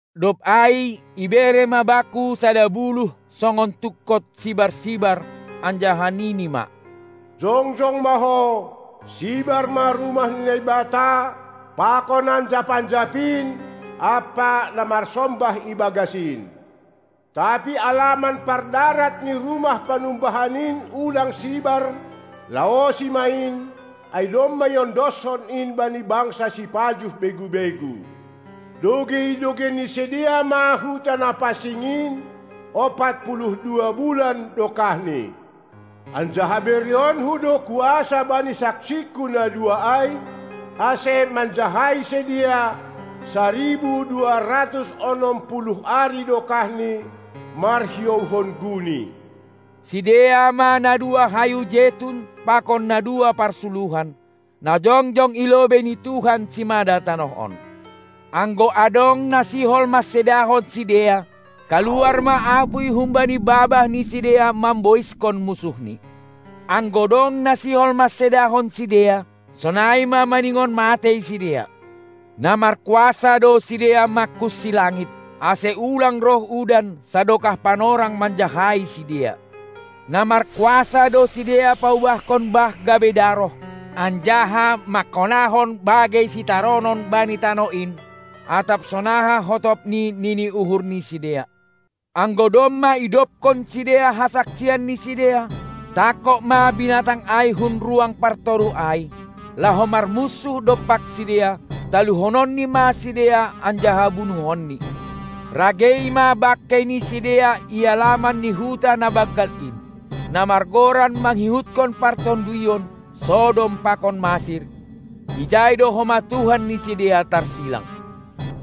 Dob ai ibere ma bakku sada buluh songon tungkot sibar-sibar anjaha nini ma: Jongjong ma ho, sibar ma rumah ni Naibata pakon anjap-anjap in ampa na marsombah ibagas in. Tapi alaman pardarat ni rumah panumbahan in ulang sibar, laosi ma in, ai domma iondoshon in bani bangsa sipajuh begu-begu. Dogei-dogeian ni sidea ma huta na pansing in ompat puluh dua bulan dokahni. Anjaha bereonKu do kuasa bani saksingKu na dua ai, ase manjahai sidea saribu dua ratus onom puluh ari dokahni, marhiouhon guni. Sidea ma na dua hayu jetun pakon na dua parsuluhan, na jongjong i lobei ni Tuhan simada tanoh on. Anggo adong na sihol mansedahon sidea, kaluar ma apuy humbani babah ni sidea mamboiskon munsuhni; anggo dong na sihol mansedahon sidea, sonai ma maningon matei sidea. Na markuasa do sidea mangkunsi langit, ase ulang roh udan sadokah panorang manjahai sidea. Na markuasa do sidea paubahkon bah gabe daroh anjaha manghonahon bagei sitaronon bani tanoh in, atap sonaha hotopni nini uhur ni sidea. Anggo domma idobkon sidea hasaksian ni sidea, tangkog ma binatang ai hun ruang partoruh ai, laho marmunsuh dompak sidea, taluhononni ma sidea anjaha bunuhonni. Ragei ma bangkei ni sidea i alaman ni huta na banggal in, na margoran mangihutkon partonduyon Sodom pakon Masir, ijai do homa Tuhan ni sidea tarsilang.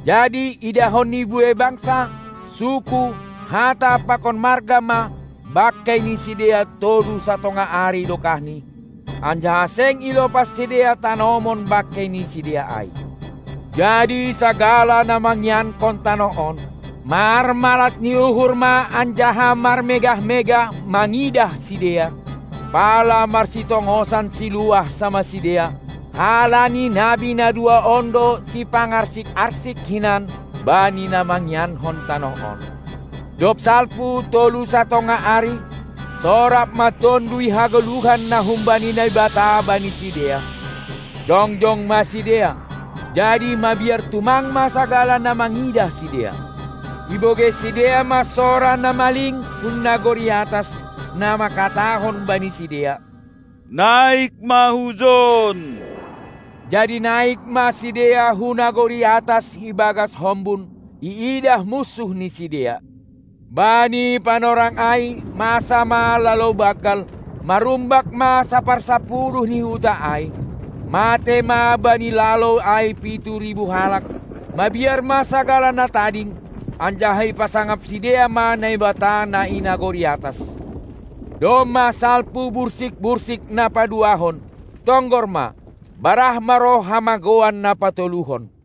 Jadi idahon ni buei bangsa, suku, hata pakon marga ma bangkei ni sidea tolu satongah ari dokahni, anjaha seng ilopas sidea tanomon bangkei ni sidea ai. Jadi sagala na mangiankon tanoh on, marmalas ni uhur ma anjaha marmegah-megah mangidah sidea, pala marsitongosan siluah samah sidea, halani nabi na dua on do sipangarsik-arsik hinan bani na mangiankon tanoh on. Dob salpu tolu satongah ari, sorap ma Tonduy hagoluhan na humbani Naibata bani sidea, jongjong ma sidea, jadi mabiar tumang ma sagala na mangidah sidea. Ibogei sidea ma sora na maling hun nagori atas, na mangkatahon bani sidea: Naik ma hujon! Jadi naik ma sidea hu nagori atas ibagas hombun, iidah munsuh ni sidea. Bani panorang ai masa ma lalou banggal, marumbak ma saparsapuluh ni huta ai, matei ma bani lalou ai pitu ribu halak, mabiar ma sagala na tading, anjaha ipasangap sidea ma Naibata na i nagori atas. Domma salpu bursik-bursik na paduahon; tonggor ma, barah ma roh hamagouan na patoluhon.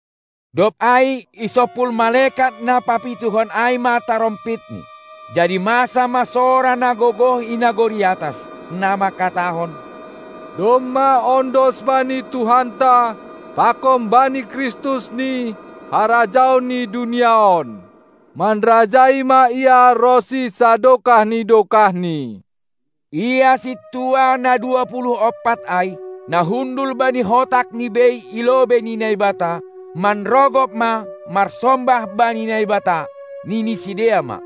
Dob ai isompul malekat na papituhon ai ma tarompitni, jadi masa ma sora na gogoh i nagori atas, na mangkatahon: Domma ondos bani Tuhanta pakon bani KristusNi harajaon ni dunia on, manrajai ma Ia ronsi sadokah ni dokahni. Ia sintua na dua puluh ompat ai, na hundul bani hotakni bei i lobei ni Naibata, manrogop ma marsombah bani Naibata. Nini sidea ma: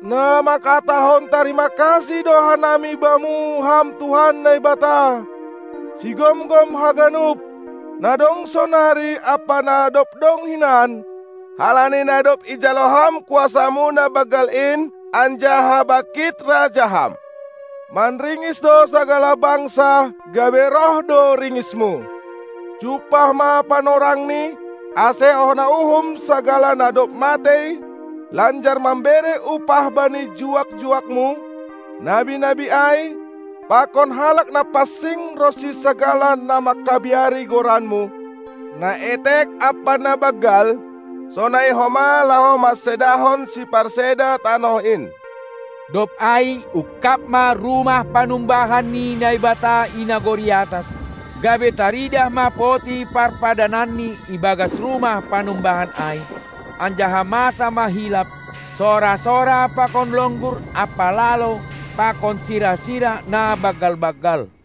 Na mangkatahon tarima kasih do hanami Bamu, Ham Tuhan Naibata, Sigomgom haganup, na dong sonari ampa na dob dong hinan, halani na dob ijalo Ham kuasaMu na banggal in anjaha bangkit Raja Ham. Manringis do sagala bangsa, gabe roh do ringisMu; jumpah ma panorangni, ase hona uhum sagala na dob matei lanjar mambere upah bani juak-juakmu, nabi-nabi ai, pakon halak na pansing ronsi sagala na mangkabiari goranMu, na etek ampa na banggal, sonai homa laho mansedahon siparseda tanoh in. Dob ai ungkab ma rumah panumbahan ni Naibata i nagori atas, gabe taridah ma poti parpadananNi ibagas rumah panumbahan ai, anjaha masa ma hilap, sora-sora pakon longgur ampa lalou pakon sira-sira na banggal-banggal.